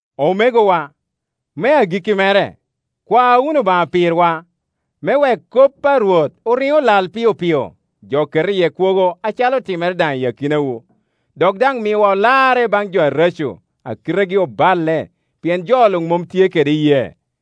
Omegowa, me agikki mere, kwa wunu Obaŋa pirwa, me wek kop a Rwot oriŋ olal piopio, jo ket iye kwogo acalo otimere daŋ i akinawu. Dok daŋ miwa olarre i baŋ jo areco, a kitegi oballe; pien jo luŋ mom tye kede iyee.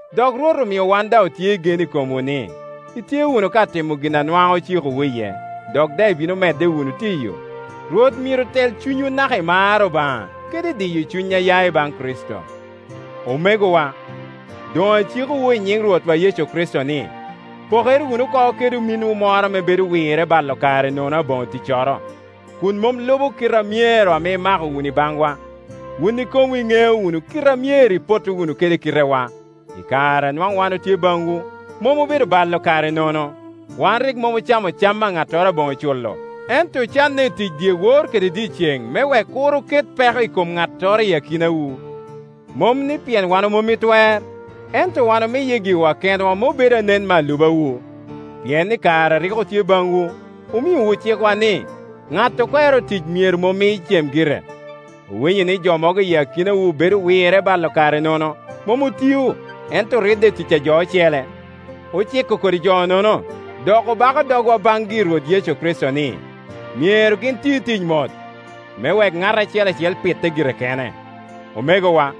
Dok Rwot omio wan daŋ otye i gen i komwu ni, itye wunu ka timo gin a nwaŋ ocikowu iye, dok daŋ ibino medde wunu tiyo. Rwot myero tel cunywu naka i mar Obaŋa kede i diyo cuny a ya i baŋ Kricito. Omegowa, doŋacikowu i nyiŋ Rwotwa Yecu Kricito ni, pokere wunu oko kede ominwu moro ame bedo wirre balo kare nono aboŋo ticcoro, kun mom lubo kite a myero ame imako wunu i baŋwa. Wun ikomwu iŋeo wunu kite a myero ipotto wunu kede kitewa. I kare a nwaŋ wan otye baŋwu, mom obedo balo kare nono. Wan rik mom ocamo cam a ŋattoro aboŋo culo, ento ocanne i tic dyewor kede dyeceŋ me wek kur oket peko i kom ŋattoro i akinawu. Mom ni pien wan omom i twer, ento wan omiye giwa kenwa me obed anen me alubawu. Pien i kare a rik otye baŋwu, omiowu cikwa ni, ŋat okwero tic myero mom cem gire. Owinyo ni jo mogo i akinawu bedo wirre balo kare nono; mom otio, ento oridde i tic ajo ocele. Ociko kodi jo-nono, dok obako dogwa baŋgi i Rwot Yecu Kricito ni, myero gin ti ticgi mot, me wek ŋat acel acel pitte gire kene. Omegowa,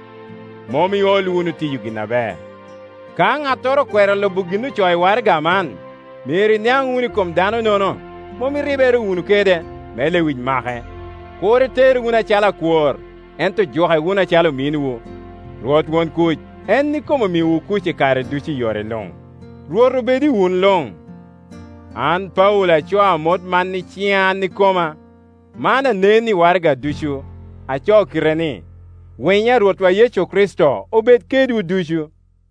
mom iol wunu tiyo gin aber. Ka ŋattoro okwero lubo gin ocoo i waraga man, myero iniaŋ wunu i kom dano-nono, mom iribere wunu kede, me lewic make. Kur itere wunu acalo akwor, ento juke wunu acalo ominwu. Rwot won kuc, en ikome omiwu kuc i kare ducu i yore luŋ. Rwot obed i wun luŋ. An Paulo acoo amot man kede ciŋa an ikoma. Man anen i waragana ducu; acoo kite-ni. Winyo a Rwotwa Yecu Kricito obed kedwu ducu.